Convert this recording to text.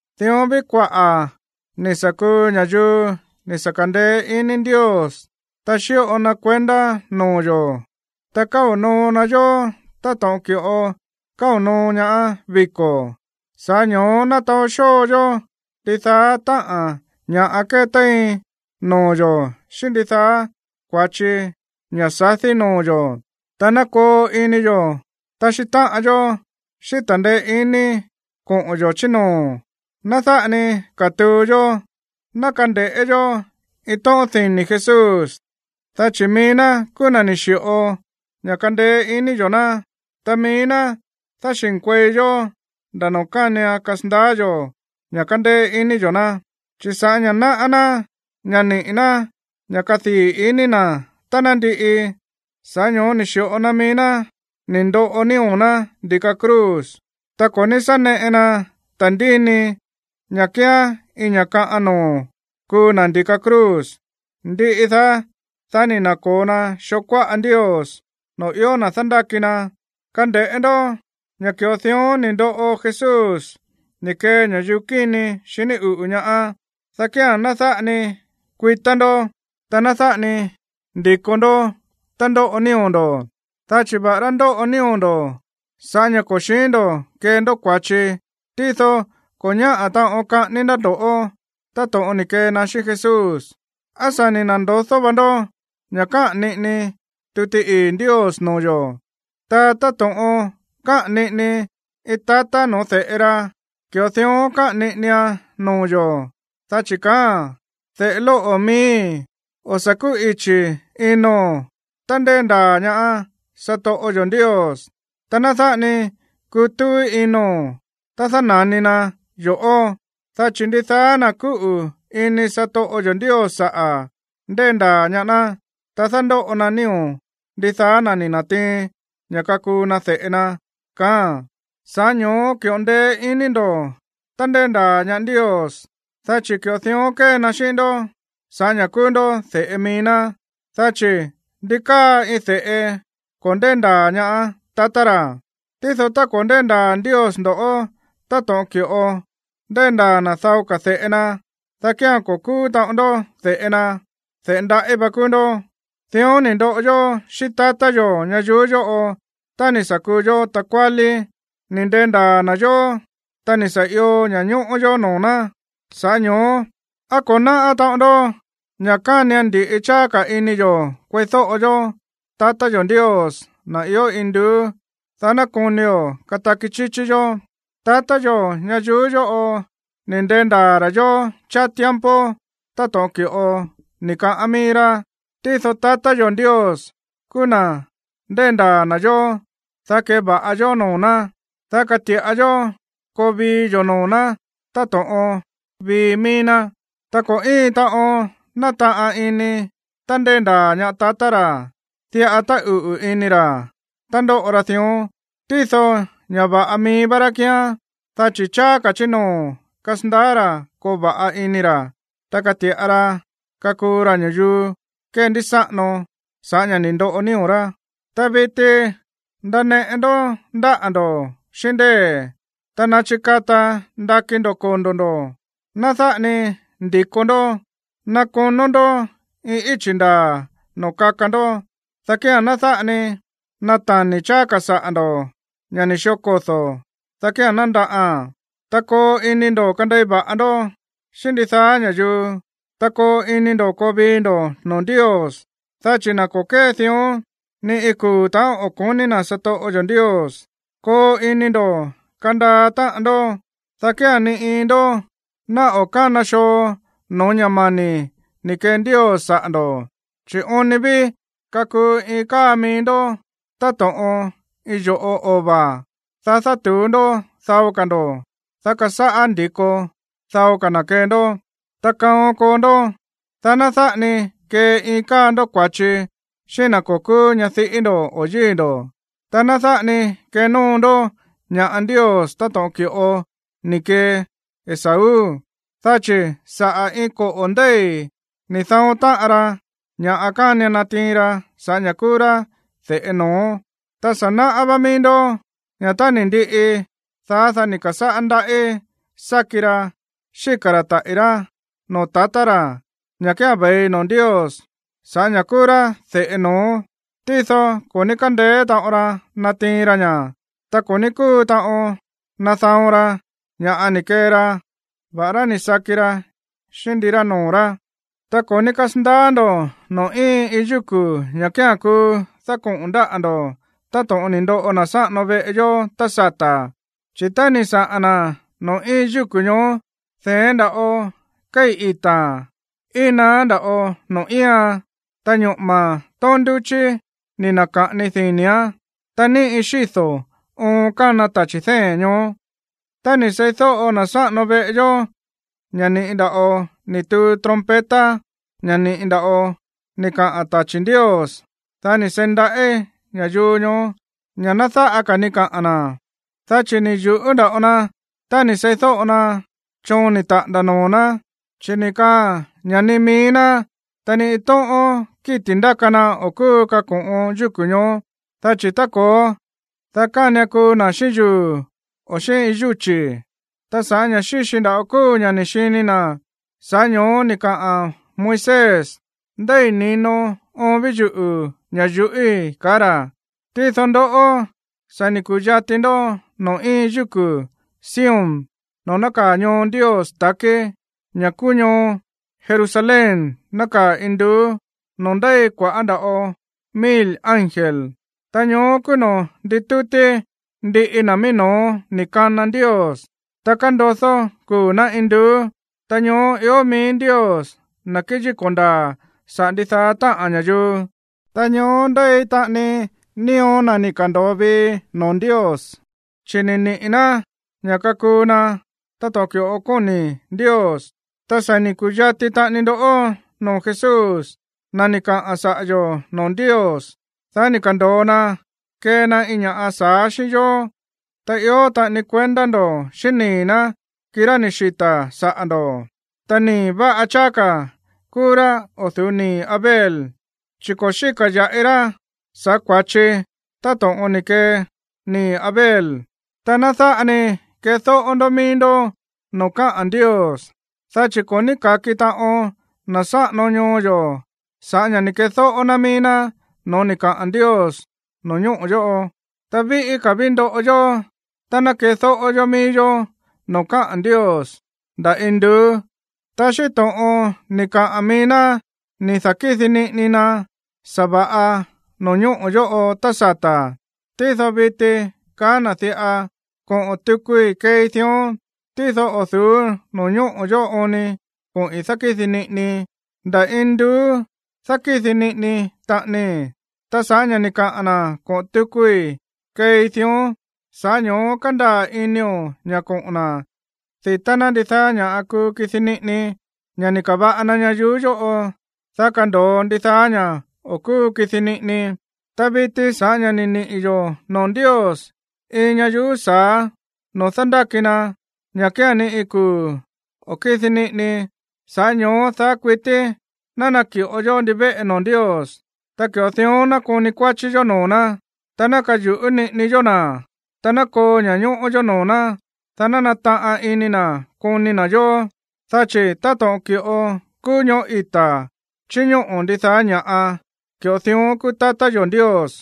Dión ví kuaꞌa̱ ni̱ sa̱ kuu ña̱yuu ni̱ sa̱ ka̱ndeé iní Ndios, ta xíꞌo na kuendá noo̱ yo̱, ta káo̱ noo na yó táto̱ꞌon ki̱ꞌo káo̱ noo ñaá viko̱. Sa̱ꞌá ño̱ó ná taó xóo yó ndidaá táꞌa̱n ña̱ꞌa kétéin noo̱ yo̱ xíꞌín ndidaá kua̱chi ña̱ sadí noo̱ yo̱, ta ná koo ini yo̱ taxí táꞌan yó xíꞌín ta̱ndeé iní koꞌo̱n yo̱ chí noo̱. Ná dáꞌa ni katuu yó. Ná kande̱ꞌé yó iin tóꞌón dini̱ Jesús, dá chi̱ mií ná kúú na̱ ni̱ xi̱ꞌo ña̱ kandeé iní yo̱ ná, ta mií ná dáxi̱nkuei yó nda̱ noo̱ kánian kasandaá yo̱ ña̱ kandeé iní yo̱ ná. Chi̱ sa̱ꞌá ña̱ náꞌá ná ña̱ niꞌi̱ ná ña̱ kadii̱ iní na̱ tá ná ndiꞌi, sa̱ꞌá ño̱ó ni̱ xi̱ꞌo na mií ná ni̱ ndoꞌo nío̱ ná ndi̱ka cruz, ta ko̱ ní sá neꞌe na ta̱ndíni ña̱ kíán iin ña̱ kaꞌan noo̱ kuu na̱ ndi̱ka cruz. Ndiꞌi daá, dá ni̱ na̱ko̱o na xoo kuáꞌa Ndios, noo̱ ió na̱ dándáki na. Kande̱ꞌé ndó ña̱ ki̱ꞌo dión ni̱ ndoꞌo Jesús ni̱ kee ña̱yuu kíni xiní uꞌu̱ ñaá, dá kía̱n ná dáꞌa ni kuitá ndo̱, ta ná dáꞌa ni ndi̱ko ndó tá ndoꞌo nío̱ ndo̱. Dá chi̱ va̱ꞌará ndóꞌo nío̱ ndo̱ sa̱ꞌá ña̱ ko̱ xi̱ín ndo̱ kee ndó kua̱chi, tído ko̱ ñáꞌa̱ taꞌon kaꞌání ná ndo̱ꞌó táto̱ꞌon ni̱ kee na xíꞌín Jesús. ¿Á sa̱ ni̱ na̱ndodó va ndó ña̱ káꞌa̱n niꞌini tuti ii̱ Ndios noo̱ yo̱? Ta táto̱ꞌon káꞌa̱n niꞌini iin tatá no̱ó de̱ꞌe ra, ki̱ꞌo dión káꞌa̱n niꞌinian noo̱ yo̱, dá chi̱ kaáa̱n: De̱ꞌe lóꞌo̱ miíi̱, o̱ sa̱ kúꞌichi̱ ino̱n tá ndéndaa̱ ñaá satoꞌo yo̱ Ndios, ta ná dáꞌa ni kutúú ino̱n tá dána̱ni na yo̱ꞌó, dá chi̱ ndidaá na̱ kúꞌu̱ ini satoꞌo yo̱ Ndios saꞌa̱, ndéndaa̱ ñaá ná, ta dándóꞌo na nío̱ ndidaá na̱ ni̱ na̱tiin ña̱ kakuu na de̱ꞌe na. Sa̱ꞌá ño̱ó ki̱ꞌo ndeé iní ndo̱ tá ndéndaa̱ ñaá Ndios, dá chi̱ ki̱ꞌo dión kée na xíꞌín ndó sa̱ꞌá ña̱ kúú ndó de̱ꞌe mií ná. Dá chi̱, ¿ndi káa iin de̱ꞌe ko̱ ndéndaa̱ ñaá tatá ra? Tído tá ko̱ ndéndaa̱ Ndios ndo̱ꞌó táto̱ꞌon ki̱ꞌo ndéndaa̱ na̱ dao ka̱ de̱ꞌe na, dá kía̱n ko̱ kúú taꞌon ndó de̱ꞌe na, de̱ꞌe ndaꞌí va kúú ndó. Dión ni̱ ndoꞌo yó xíꞌín tatá yo̱ ñayuú yóꞌo tá ni̱ sa̱ kuu yó takuálí, ni̱ ndendaa̱ na̱ yó, ta ni̱ sa̱ io ña̱ñóꞌó yó noo̱ ná. Sa̱ꞌá ño̱ó, ¿á ko̱ náꞌá taꞌon ndó ña̱ kánian ndi̱ꞌi cháá ka̱ ini yo̱ kueídóꞌo yó tatá yo̱ Ndios, na̱ ió induú, dá ná konio̱ kataki chíchí yó? Tatá yo̱ ñayuú yóꞌo ni̱ ndendaa̱ ra̱ yó cháá tiempo táto̱ꞌon ki̱ꞌo ni̱ kaꞌán mií rá. Tído tatá yo̱ Ndios kúú na̱ ndéndaa̱ na̱ yó, dá keva̱ꞌa yó noo̱ ná, dá kati̱ꞌa yó koo vii yo̱ noo̱ ná táto̱ꞌon vii mií ná. Ta ko̱ íin taꞌon nátaꞌan ini tá ndéndaa̱ ñaá tatá xi̱, diꞌa táꞌuꞌu̱ ini xi̱ tá ndóꞌo xi dión. Tído ña̱ va̱ꞌa mií vá xí kíán, dá chi̱ cháá ka̱ chí noo̱ kasandaá xi̱ koo va̱ꞌa ini xi̱, ta kati̱ꞌa xi kakuu xi ña̱yuu kendísáꞌano sa̱ꞌá ña̱ ni̱ ndoꞌo nío̱ xí. Ta viti ndaneꞌe ndó ndáꞌa̱ ndo̱ xíꞌín ndée̱, ta ná chikata ndakí ndo̱ kondo̱ ndo̱. Ná dáꞌa ni ndi̱ko ndó. Ná konó ndó iin íchi̱ ndaa̱ noo̱ kaka ndó, dá kía̱n ná dáꞌa ni natani̱ cháá ka̱ saꞌa̱ ndo̱, ña̱ ni̱ xió kodo̱, dá kía̱n ná ndaꞌaan. Ta koo ini ndo̱ kandei va̱ꞌa ndó xíꞌín ndidaá ña̱yuu, ta koo ini ndo̱ koo vii ndo̱ noo̱ Ndios, dá chi̱ na̱ ko̱ kée dión, ni iin kuu̱ ta̱ꞌón o̱ ko̱ní na̱ satoꞌo yo̱ Ndios. Koo ini ndo̱ kandaa táꞌan ndó, dá kía̱n ni iin ndó ná o̱ kána xoo no̱ó ña̱ mani̱ ni̱ kee Ndios saꞌa̱ ndo̱. Chi̱ oon ni ví kakuu iin káa mií ndó táto̱ꞌon iin yo̱ꞌo ova̱, dá dátu̱ú ndó dao ka̱ ndo̱, dá kasáꞌá ndi̱ko dao ka̱ na̱ kee ndó. Ta kaon koo ndó, dá ná dáꞌa ni kee iin káa ndoꞌó kua̱chi xíꞌín na̱ ko̱ kúú ñadiꞌí ndo̱ o yíi̱ ndo̱. Ta ná dáꞌa ni kenóo ndó ña̱ꞌa Ndios táto̱ꞌon ki̱ꞌo ni̱ kee Esaú, dá chi̱ saꞌa̱ iin koꞌo̱ ndéi̱ ni̱ da̱on táꞌan ra ña̱ kánian natiin ra sa̱ꞌá ña̱ kúú rá de̱ꞌe no̱ó. Ta sa̱ náꞌá vá mií ndó ña̱ tá ni̱ ndiꞌi daá, dá ni̱ ka̱sáꞌá ndaꞌí sáki ra xíka̱ ra̱ taꞌi̱ rá noo̱ tatá ra̱, ña̱ kía̱n ve̱i noo̱ Ndios sa̱ꞌá ña̱ kúú rá de̱ꞌe no̱ó, tído ko̱ ní kándeé taꞌon ra natiin ra ña̱, ta ko̱ ní kúu taꞌon nada̱on ra ña̱ ni̱ kee ra, va̱ꞌará ni̱ saki ra xíꞌín ndirá noo̱ rá. Ta ko̱ ní kasandaá ndo̱ noo̱ íin iin yúku̱, ña̱ kía̱n kuu dákoꞌo̱n ndáꞌa̱ ndo̱ táto̱ꞌon ni̱ ndoꞌo na̱ sáꞌano veꞌe yó tá sata̱, chi̱ tá ni̱ saa̱ na̱ noo̱ íin yúku̱ ñoó, de̱én nda̱ꞌo kéi̱ ita̱a̱n, íin naá nda̱ꞌo noo̱ íian, ta ñoꞌo̱ma̱ tóón ndúchí ni̱ na̱ka̱ꞌani dini̱án, ta níꞌi xído̱ oon kána tachi̱ dée̱n ñoó. Tá ni̱ seídóꞌo na̱ sáꞌano veꞌe yó ña̱ ni̱ꞌi nda̱ꞌo ni̱ tuu trompeta, ña̱ ni̱ꞌi nda̱ꞌo ni̱ kaꞌa̱n tachi̱ Ndios, dá ni̱ seí ndaꞌí ña̱yuu ñoó ña̱ ná dáꞌa ka̱ ni kaꞌa̱n na̱, dá chi̱ ni̱ yu̱ꞌú nda̱ꞌo na tá ni̱ seídóꞌo na choon ni̱ taꞌa̱nda̱ noo̱ ná, chi̱ ni̱ kaꞌa̱n ña̱ ni mií ná, ta ni iin tóꞌón kíti̱ ndáka na o̱ kúu kako̱ꞌon yúku̱ ñoó, dá chi̱ tá ko̱ó, dá kánian kuu na̱ xíꞌín yuu̱, o xíꞌín iin yúchi̱. Ta sa̱ꞌá ña̱ xíxi nda̱ꞌo kúu ña̱ ni̱ xini na̱, sa̱ꞌá ño̱ó ni̱ kaa Moisés: “Ndéi̱ ni̱no oon ví yuꞌu̱ ña̱ yuꞌíi̱”, kaá ra̱. Tído ndoꞌó, sa̱ ni̱ ku̱yati ndó noo̱ íin yúku̱ Sion noo̱ nákaa̱ ñoo Ndios ta̱kí, ña̱ kúú ñoo Jerusalén nákaa̱ induú, noo̱ ndéi kua̱ꞌá nda̱ꞌo mil ángel. Ta ñoó kúú noo̱ ndítútí ndiꞌi na̱ mií no̱ó ni̱ kana Ndios, ta kándodó kuu̱ ná induú. Ta ñoó ió mií Ndios, na̱ kéyíko̱ ndaa̱ saꞌa̱ ndidaá táꞌa̱n ña̱yuu. Ta ñoó ndéi taꞌani nío̱ na̱ ni̱ ka̱ndo̱o vii noo̱ Ndios, chi̱ ni̱ niꞌi̱ ná ña̱ kakuu na táto̱ꞌon ki̱ꞌo kóni̱ Ndios. Ta sa̱ ni̱ ku̱yati taꞌani ndó noo̱ Jesús, na̱ ni̱ kaꞌa̱n saꞌa̱ yo̱ noo̱ Ndios, dá ni̱ ka̱ndo̱o na kee na iin ña̱ sa̱á xíꞌín yó. Ta ió taꞌani kuendá ndo̱ xíꞌín nii̱ ná, kirá ni̱ xita̱ saꞌa̱ ndo̱. Ta nii̱ va̱ꞌa cháá ka̱ kúú rá o̱ du̱ú nii̱ Abel, chi̱ ko̱ xíka̱ ya̱ꞌi ra sa̱ꞌá kua̱chi táto̱ꞌon ni̱ kee nii̱ Abel. Ta ná dáꞌa ni kedóꞌó ndó mií ndó noo̱ káꞌa̱n Ndios. Dá chi̱ ko̱ ní ka̱ki taꞌon na̱ sáꞌano ñoo yo̱ sa̱ꞌá ña̱ ni̱ kedóꞌó ná mií ná no̱ó ni̱ kaꞌa̱n Ndios no̱ñóꞌo̱ yóꞌo. Ta víꞌí ka̱ ví ndoꞌo yó tá ná kedóꞌó yó mií yó noo̱ káꞌa̱n Ndios nda̱ induú. Ta xíꞌín to̱ꞌon ni̱ kaꞌa̱n mií ná ni̱ da̱kídi niꞌini na sa̱va̱ꞌa no̱ñóꞌo̱ yóꞌo tá sata̱, tído viti kaá na̱ diꞌa: “Koꞌo̱n tukui keei dión, tído o̱ du̱ú no̱ñóꞌo̱ yóꞌo oon ni koꞌi̱n dákídi niꞌinii, nda̱ induú dákídi niꞌini taꞌanii.” Ta sa̱ꞌá ña̱ ni̱ kaa na̱ “koꞌo̱n tukui keei dión”, sa̱ꞌá ño̱ó kándaa̱ inio̱ ña̱ koꞌo̱n na̱ di̱tá ná ndidaá ña̱ kuu kidi niꞌini, ña̱ ni̱ ka̱va̱ꞌa na ñayuú yóꞌo, dá kando̱o ndidaá ña̱ o̱ kúu kidi niꞌini. Ta viti, sa̱ꞌá ña̱ ni̱ niꞌi̱ yo̱ noo̱ Ndios iin ñayuú sa̱á noo̱ dándáki na, ña̱ kía̱n ni iin kuu̱ o̱ kídi niꞌini, sa̱ꞌá ño̱ó daá kuití ná naki̱ꞌo yó ndivéꞌe noo̱ Ndios. Ta ki̱ꞌo dión ná koni kuáchí yó noo̱ ná, ta ná kayu̱ꞌú niꞌini yó na̱, ta ná koo ña̱ñóꞌó yó noo̱ ná, dá ná nataꞌan ini na̱ koni na̱ yó. Dá chi̱ táto̱ꞌon ki̱ꞌo kúú ñoꞌó ita̱ chíñóꞌo̱ ndidaá ña̱ꞌa, ki̱ꞌo dión kúú tatá yo̱ Ndios.